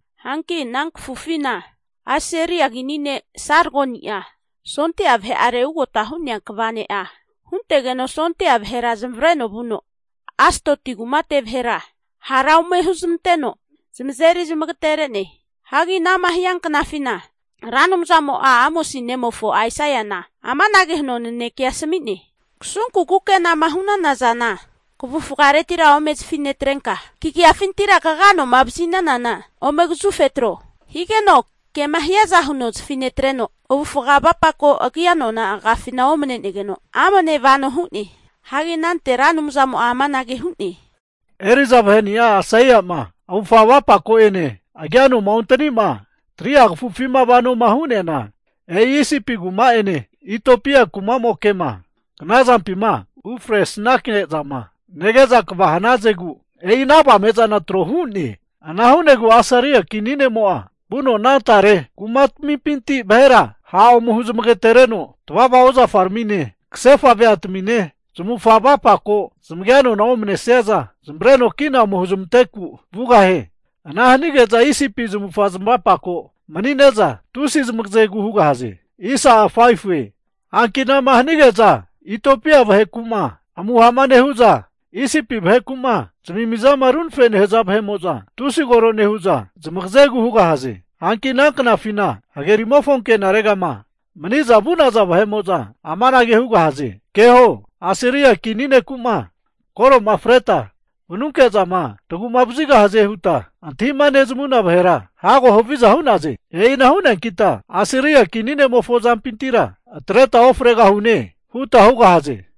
Hanki ana kafufina Asiria kini ne' Sargoni'a sondia vahe'are ugota hu'nea kva ne'a huntegeno sondia vahera zamavareno vuno, Astodi kumate vahera hara ome huzmanteno zamazeri zamagatere'ne. Hagi anama hia knafina, Ra Anumzamo'a Amosi nemofo Aisaiana amanage huno nanekea asami'ne, kasunku kukenama hu'nana zana kavufaretira ome zafi netrenka, kagia noma vazi'nanana ome kazufe atro. Higeno kema hiaza huno zafi netreno, avufa avapako agia nona agiafina omanenegeno amne vano hu'ne. Hagi anante Ra Anumzamo'a amanage hu'ne, eri'za vahe'ni'a Aisaia'ma avufga avapako'ene agianoma ontani'ma 3'a kafufima vanoma hu'neana, e'i Isipi kumamo'ene Itiopia kumamoke'ma knazampima ufresnanke'zama nege'za kva hanazegu, e'i ana avame'zana tro hu'ne. Ana hu'negu Asiria kini ne'mo'a vuno ana tare kumatmimpinti vahera ha' ome huzmagatereteno, tavava ozafaramine, kasefa veatamine, zamavufaga avapako zamagia nona omanesiaza zamavareno kina ome huzmanteku vugahie. Ana hanige'za Isipi mopare zamavufaga zamavapako mani'ne'za tusi zamagazegu hugahaze. Hanki anama hanage'za Itiopia vaheku'ma amuha'ma nehu'za, Isipi vaheku'ma zamimizama runafe'ma nehaza vahe'mo'za, tusi koro nehu'za, zamagazegu hugahaze. Hanki ana knafina hagerimofo ankenaregama mani'za vu'naza vahe'mo'za amanage hugahaze, keho, Asiria kini neku'ma koro'ma freta vanunke'zama tagu'vazigahazema huta antahima nezamuna vahera hago haviza hu'naze. E'ina hu'neankita Asiria kini ne'mofo azampintira atreta ofregahune huta hugahaze.